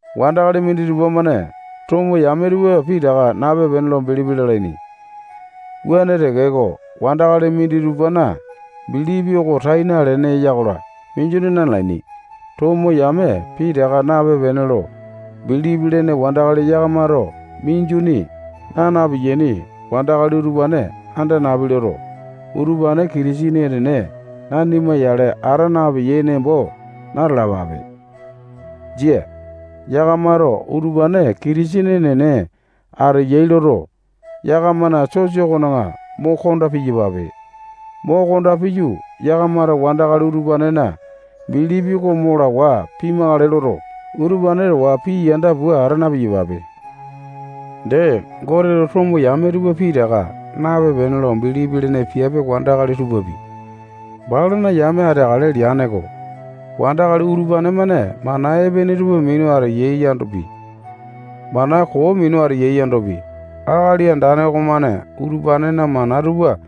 Wandakali minditupa-mane tomo yame tupa pitaka nape-pene lo bilipi lalaini. Wuane tekeko, wandakali minditupana bilipi oko tai nalene eya-kola, minjuni nanalaini. Tomo yame pitaka nape-pene lo bilipi lene wandakali yakamato minjuni naa na-piyaini wandakali utupane anda napi loto, utupane Kitisene enene nanima yale ata napeyai nembo na-talapape. Jia. Yakamato utupane Kitisene enene ateyai loto, yakamana sosa okona mo konda piyapape. Mo konda piyu, yakamato wandakali utupanena bilipi oko mo lawa pimakale loto, utupane towa pii yanda pua ata na-piyapape. Dee, Goteto tomo yame tupa pitaka nape-pene lo bilipi lene piape wandakali tupapi balana yame ateakale leane-ko. Wandakali utupane-mane mana epene tupa minu ateyai yandopi, mana koo minu ateyai yandopi, Akali Andane okomane utupanena mana tupa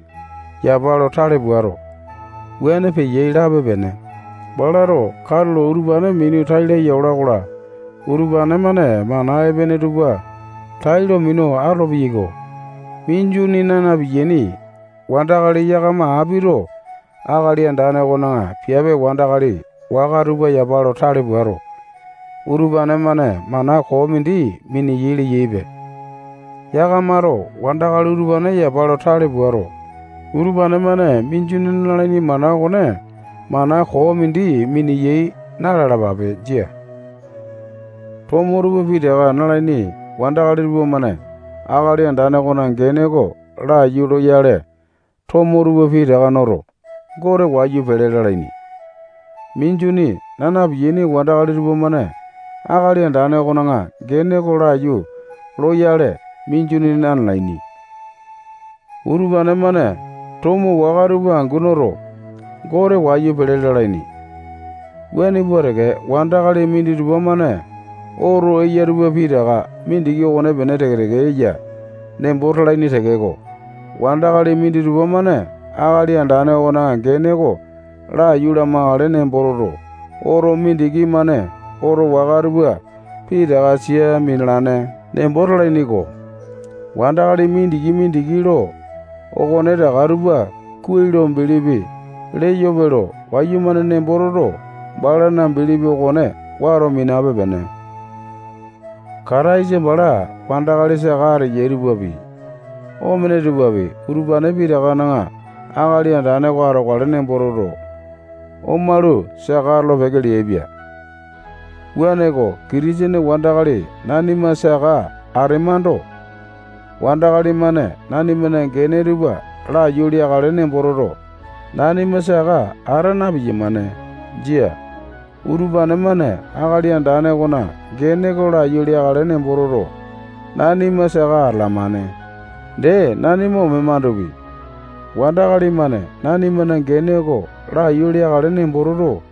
yapa lo tale puato, wuane peyai lape-pene. Balato katulo utupane minu tai laya ola-kola, utupane-mane mana epene tupa tailo minu atolo-peyaiko. Minjuni naa na-piyaini wandakali yakama apito Akali Andane okona piape wandakali waka tupa yapa lo tale puato, utupane-mane mana koo mindi mineyai leyaipe. Yakamato wandakali utupane yapa lo tale puato, utupane-mane minjuni nalaini mana okone mana koo mindi miniyai na-lalapape. Jia. Tomo tupa pitaka nalaini wandakali tupamane Akali Andane okona gene oko laiyu loyale, tomo tupa pitaka noto, Gote wayu pele lalaini. Minjuni naa na-piyaini wandakali tupamane Akali Andane okona gene oko laiyu loyale, minjuni nanalaini. Utupane-mane, tomo waka tupa angu noto, Gote wayu pele lalaini. Wuane pua teke, wandakali minditupa-mane oto eya tupa pitaka mindiki okonepene teke-teke eya nembo talaini tekeko, wandakali minditupa-mane Akali Andane okona gene oko laiyu lamakale nembo toto, oto mindiki-mane oto waka tupa pitaka sia minalane nembo talaini-ko. Wandakali mindiki-mindiki lo okonetaka tupa kuai lo bilipi leyope lo wayumane nembo toto, balana bilipi okone wato minape-pene. Kataisa bala wandakali saka ateyai tupapi, omene tupapi, utupane pitakana Akali Andane oko atokale nembo toto, omalu, saka atolo-peke leaipia. Wuaneko, Kitisene wandakali nanima saka atemando, wandakali-mane nanimana gene tupa laiyu leakale nembo toto, nanima saka ata na-piyamane. Jia. Utupane-mane Akali Andane okona gene oko laiyu leakale nembo toto, nanima saka atalamane. Dee, nanima omemandopi, wandakali-mane nanimana gene oko laiyu leakale nembo toto,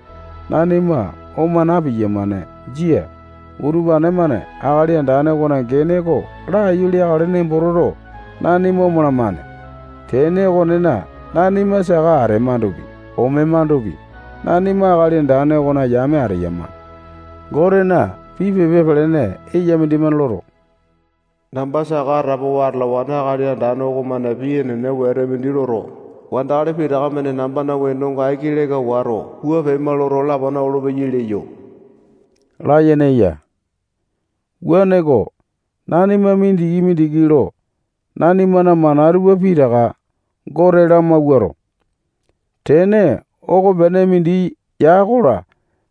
nanima oma na-piyamane. Jia. Utupane-mane Akali Andane okona gene oko laiyu leakale nembo toto, nanima omalamane. Tene okonena, nanima saka atemandopi, omemandopi, nanima Akali Andane okona yame ateyama. Gotena pii pepa pelene eya mindimane loto, namba saka atapowa atalawane Akali Andane okomane pii enene wete mindi loto, wandakali pitaka-mane nambana wenonga aiki leka wato, wua pema loto, lapana olopeyai leyo layene eya. Wuaneko, nanima mindiki-mindiki lo nanimana mana tupa pitaka Gote lamawuato, tene okopene mindi ya-kola,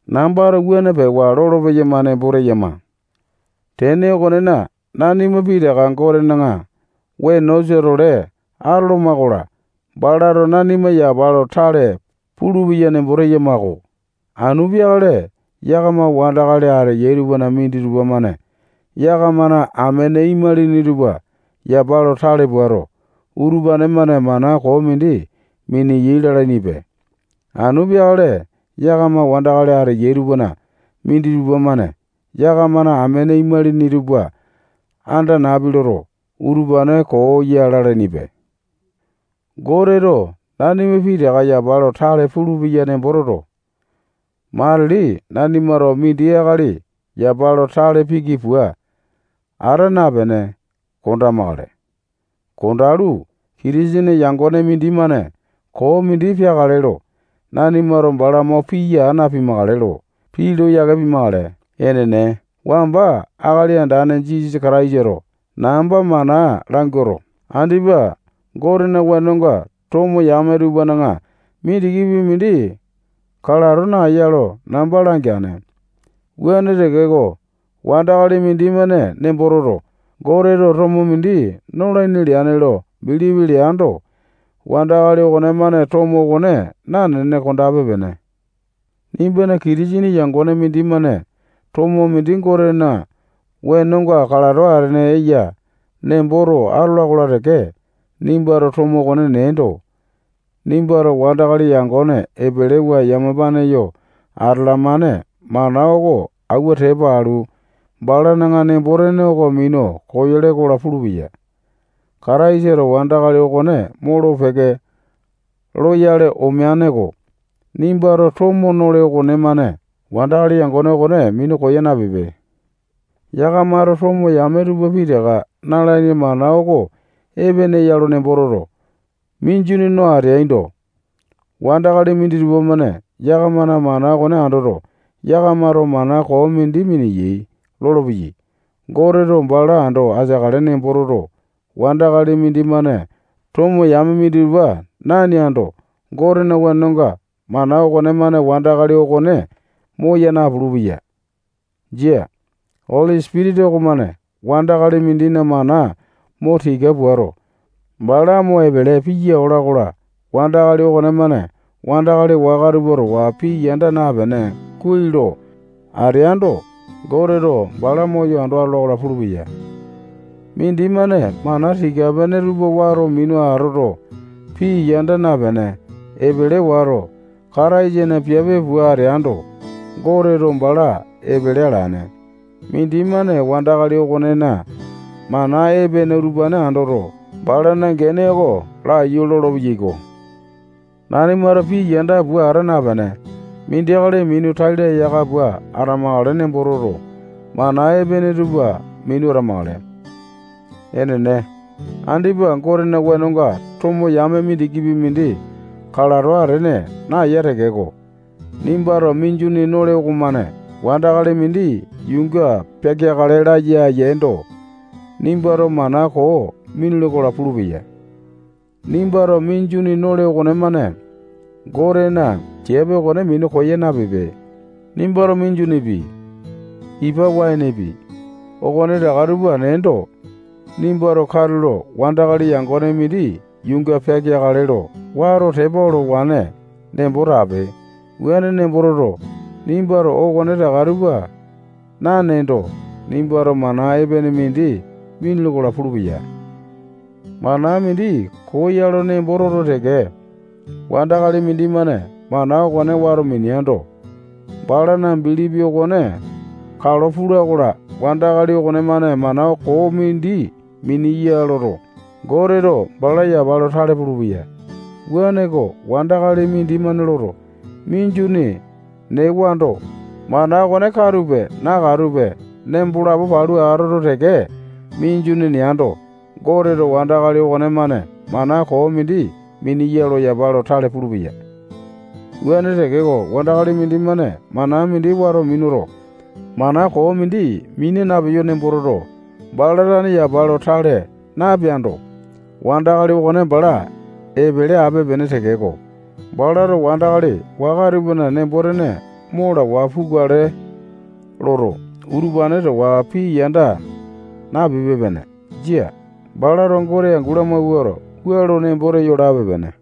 nambato wuane pewa lolo-peyama nembo teyama. Tene okonena, nanima pitaka Gotena wenosa-tole atoloma-kola, balato nanima yapa lo tale pulupeya nembo teyama-ko. Anu peakale yakama wandakali ateyai tupana minditupa-mane yakamana amene imalini tupa yapa lo tale puato, utupane-mane mana koo mindi miniyai lalainipe. Anu peakale yakama wandakali ateyai tupana minditupa-mane yakamana amene imalini tupa anda napi loto, utupane koo ya lalainipe. Goteto nanima pitaka yapa lo tale pulupeya nembo toto, matili nanimato mindi akali yapa lo tale piki pua ata napene, kondamakale. Kondalu, Kitisene yangone mindimane koo mindi peakale lo nanimato bala mo piya aa napimakale lo pii lo yake pimakale. Enene, wamba Akali Andane Jisasa Kataisato namba mana languato, andipa Gotena wenonga tomo yame tupana mindikipi mindi kalato naeya lo namba langeane. Wuane tekeko, wandakali mindimane nembo toto, Goteto tomo mindi nolaini leane lo bilipi leando, wandakali okonemane tomo okone nanene kondape-pene. Nimbana Kitisene yangone mindimane tomo mindi Gotena wenonga kalato atene eya nemboto atola-kola teke, nimbato tomo okone neendo, nimbato wandakali yangone epelewa yamapane yo atalamane mana oko auwa tepa alu, balana nembo-tene oko minu koyole-kola pulupeya. Kataisato wandakali okone molo-peke loyale omeane-ko. Nimbato tomo nole okonemane wandakali yangone okone minu koya napipe. Yakamato tomo yame tupa pitaka nalaini mana oko epene ya lo nembo toto, minjuni no ateaindo, wandakali minditupa-mane yakamana mana okone andoto, yakamato mana koo mindi mineyai lolopeyai. Goteto bala ando ateakale nembo toto, wandakali mindimane tomo yame minditupa naneando, Gotena wenonga mana okonemane wandakali okone moya napulu-peya. Jia. Oli Sipitisa okomane wandakali mindina mana mo tika puato, bala mo epele piya ola-kola, wandakali okonemane wandakali waka tupa towa pii yanda napene, kuai lo ateando, Goteto bala moyo ando atola-kola pulupeya. Mindimane mana tika-pene tupa wato minu atoto, pii yanda napene, epele wato, Kataisana piape pua ateando, Goteto bala epele alane. Mindimane wandakali okonena mana epene utupane andoto, balana gene oko laiyu lolopeyai-ko. Nanimato pii yanda pua ata napene, mindi akali minu tai laya aka pua atamakale nembo toto, mana epene tupa minu atamakale. Enene, andipa Gotena wenonga tomo yame mindikipi mindi kalato atene naeya tekeko, nimbato minjuni nole okomane wandakali mindi yuunga peakeakale laya yeendo, nimbato mana koo minule-kola pulupeya. Nimbato minjuni nole okonemane Gotena piape okone minu koya napipe. Nimbato minjunipi, ipa waenepi, okonetaka tupa neendo, nimbato katulo wandakali yangone mindi yuunga peakale lo wato tepa olowane nembo tape. Wuane nembo toto, nimbato okonetaka tupa naneendo, nimbato mana epene mindi minule-kola pulupeya. Mana mindi koo ya lo nembo toto teke, wandakali mindimane mana okone wato mineando, balana bilipi okone kalo pula-kola, wandakali okonemane mana koo mindi miniya loto, Goteto bala yapa lo tale pulupeya. Wuaneko, wandakali mindimane loto, minjuni newando, mana okone katupe, nakatupe nembo lapo palu atoto teke, minjuni neando, Goteto wandakali okonemane mana koo mindi miniya lo yapa lo tale pulupeya. Wuane tekeko, wandakali mindimane mana mindi wato minuto, mana koo mindi mina napeyo nembo toto, bala tane yapa lo tale napeando, wandakali okone bala epele ape-pene tekeko, balato wandakali waka tupana nembo-tene mo lawa pukale loto, utupane towa pii yanda napipe-pene. Jia. Balato Gote angu lamawuato, wua lo nembo teyo lape-pene.